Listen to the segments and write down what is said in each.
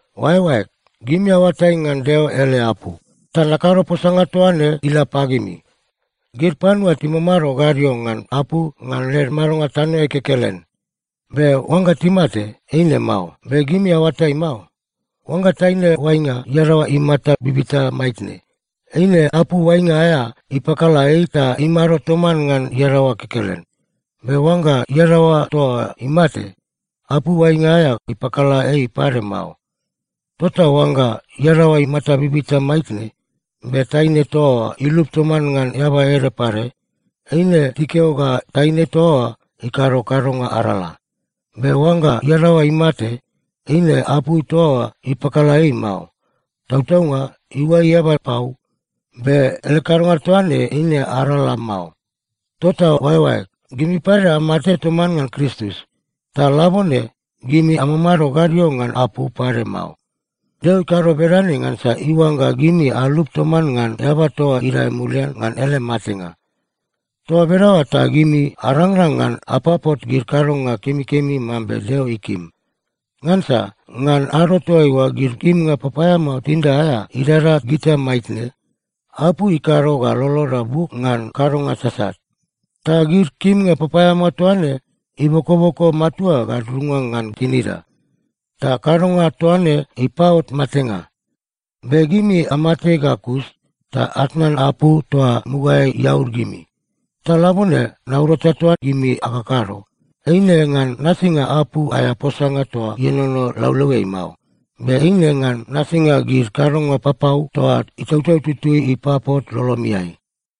Oaeoaeg, gimi aoatai ngan Deo ele apu, ta nakado posanga toa ne ila pagimi. Gid panua timamado gadio ngan apu ngan led madonga tanoeai kekelen. Be oangga timate, eine mao. Be gimi aoatai mao? Oangga taine oainga iadaoa imata bibita maitne, eine apu oainga aea ipakala ei ta imado toman ngan iadaoa kekelen. Be oangga iadaoa toa oa imate, apu oainga aea ipakala ei pade mao. Tota oangga iadaoa imata bibita maitne, be taine toa oa ilup toman ngan eaba ede pade, eine tikeo ga taine toa oa ikado kadonga arala. Be oangga iadaoa imate, eine apu toa oa ipakala ei mao. Tautaunga iuai eaba pau, be ele kadonga toa ne eine arala mao. Tota oaeoaeg, gimi pade amate toman ngan Kristus. Ta labone gimi amamado gadio ngan apu pade mao. Deo ikado bedane ngansa iuangga gimi alup toman ngan eaba toa idae mulian ngan ele matenga. Toa bedaoa ta gimi arangrang ngan apapot gid kadonga kemikemi mambe Deo ikim. Ngansa ngan ado toaiua gid kimnga papaeamao tinida aea idada gita maitne, apu ikado ga loloda buk ngan kadonga sasat. Ta gid kimnga papaeamao toa ne ibokoboko matua gadudunga ngan tinida. Ta kadonga toa ne ipaot matenga. Be gimi amate ga kus ta atnan apu toa mugaeai iaud gimi. Ta labone naurata toa gimi akakado, eine ngan nasinga apu aea posanga toa ienono laulauiai mao, be eine ngan nasinga gid kadonga papau toa Itautau Tutui ipapot lolomiai.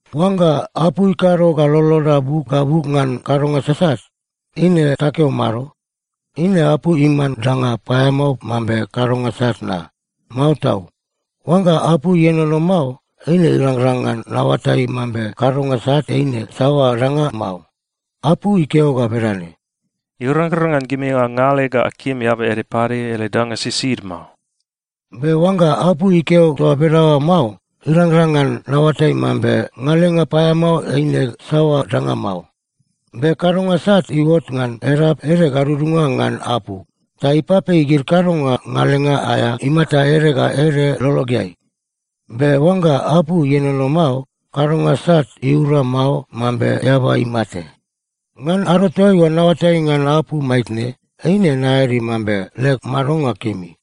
Oangga apu ikado ga loloda buk ga buk ngan kadonga sasat, eine takeo mado? Eine apu iman danga paeamao mambe kadonga sat na? Mao tau! Oangga apu ienono mao, eine irangrang ngan naoatai mambe kadonga sat eine saoa danga mao. Apu ikeo ga bedane, “Irangrang ngan gimi angale ga akim eaba ede pade ele danga sisid mao.” Be oangga apu ikeo toa bedaoa mao, irangrang ngan naoatai mambe ngalenga paeamao eine saoa danga mao. Be kadonga sat iuot ngan edap ede gadudunga ngan apu, ta ipapei gid kadonga ngalenga aea imata ede ga ede lologeai. Be oangga apu ienono mao, kadonga sat iura mao mambe eaba imate. Ngan ado toaiua naoatai ngan apu maitne, eine naeadi mambe leg madonga kemi.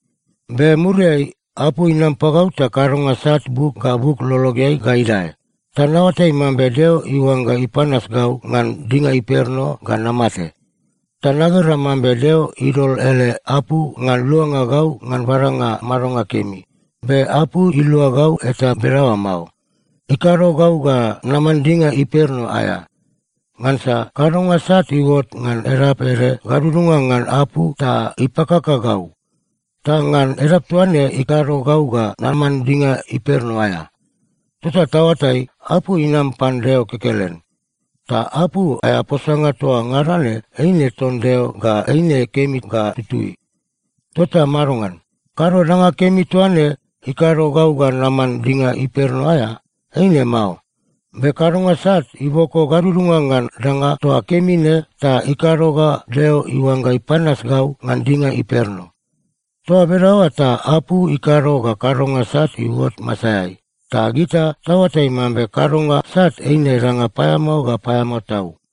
Be muriai apu inam pagau ta kadonga sat buk ga buk lologeai ga idae, ta naoatai mambe Deo iuangga ipanas gau ngan dinga imperno ga namate. Ta nagera mambe Deo idol ele apu ngan luanga gau ngan badanga madonga kemi, be apu ilua gau eta bedaoa mao. Ikado gau ga naman dinga imperno aea. Ngansa kadonga sat iuot ngan edap ede gadudunga ngan apu ta ipakaka gau. Ta ngan edap toa ne ikado gau ga naman dinga imperno aea. Tota taoatai, apu inam pan Deo kekelen. Ta apu aea posanga toa ngada ne eine ton Deo ga eine kemi ga tutui. Tota madongan? Kado danga kemi toa ne ikado gau ga naman dinga imperno aea? Eine mao. Be kadonga sat iboko gadudunga ngan danga toa kemi ne ta ikado ga Deo iuangga ipanas gau ngan dinga imperno. Toa bedaoa ta apu ikado ga kadonga sat iuot masaeai, ta gita taoatai mambe kadonga sat eine danga paeamao ga paeamao tau.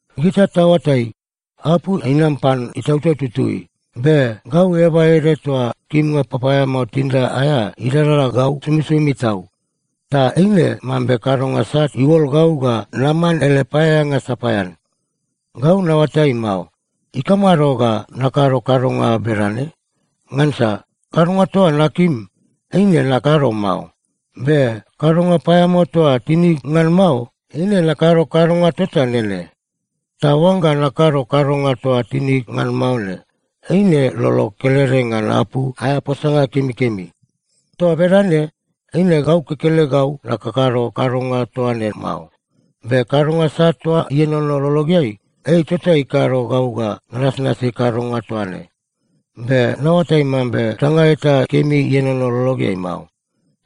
Gita taoatai, apu inam pan Itautau Tutui. Be gau eaba ede toa kimnga papaeamao tinida aea idada gau somisomi tau. Ta eine mambe kadonga sat iuol gau ga naman ele paeaeanga sapaean. Gau naoatai mao, ikamado ga nakado kadonga bedane? Ngansa kadonga toa nakim, eine nakado mao. Be kadonga paeamao toa tinig ngan mao, eine nakado kadonga tota nene. Ta oangga nakado kadonga toa tinig ngan mao ne, eine lolog kelede ngan apu aea posanga kemikemi. Toa bedane, eine gau kekelegau nakakado kadonga toa ne mao. Be kadonga sat toa ienono lologeai, ei tota ikado gau ga nanasnasi kadonga toa ne. Be naoatai mambe danga eta kemi ienono lologeai mao.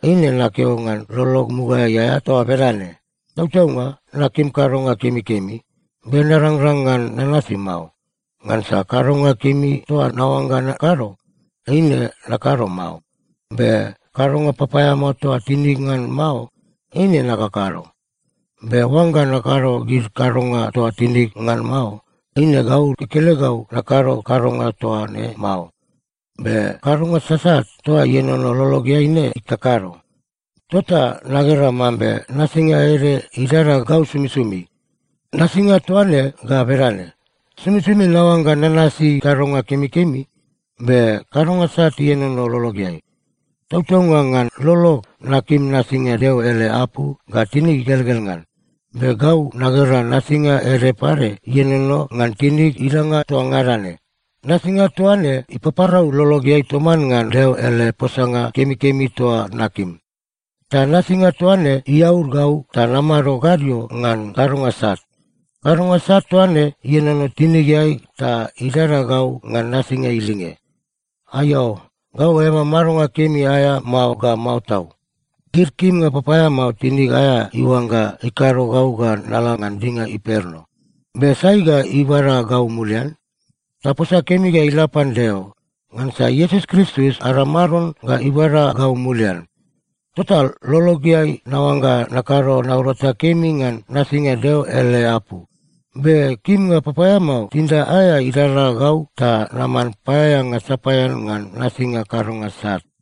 Eine nakeo ngan lolog mugaeai aea toa bedane. Tautaunga nakim kadonga kemikemi, be narangrang ngan nanasi mao. Ngansa kadonga kemi toa naoangga nakado, eine nakado mao. Be kadonga papaeamao toa tinig ngan mao, eine nakakado. Be oangga nakado gid kadonga toa tinig ngan mao, eine gau kekelegau nakado kadonga toa ne mao. Be kadonga sasat toa ienono lologeai ne ikakado. Tota nagera mambe nasinga ede idada gau somisomi. Nasinga toa ne ga bedane: Somisomi naoangga nanasi kadonga kemikemi, be kadonga sat ienono lologeai. Tautaunga ngan lolog, nakim nasinga Deo ele apu ga tinig igelgel ngan. Be gau nagera nasinga ede pade ienono ngan tinig idanga toa ngada ne. Nasinga toa ne ipaparau lologeai toman ngan Deo ele posanga kemikemi toa nakim. Ta nasinga toa ne iaud gau ta namado gadio ngan kadonga sat. Kadonga sat toa ne ienono tinigeai ta idada gau ngan nasinga ilinge. Aiao! Gau eaba madonga kemi aea mao ga mao tau. Gid kimnga papaeamao tinig aea iuangga ikado gau ga nala ngan dinga imperno. Be sai ga ibada gau mulian? Taposa kemi ga ila pan Deo! Ngansa Iesus Kristus ada Maron ga ibada gau mulian. Tota lologeai naoangga nakado naurata kemi ngan nasinga Deo ele apu, be kimnga papaeamao tinida aea idada gau ta naman paeaeanga sapaean ngan nasinga kadonga sat.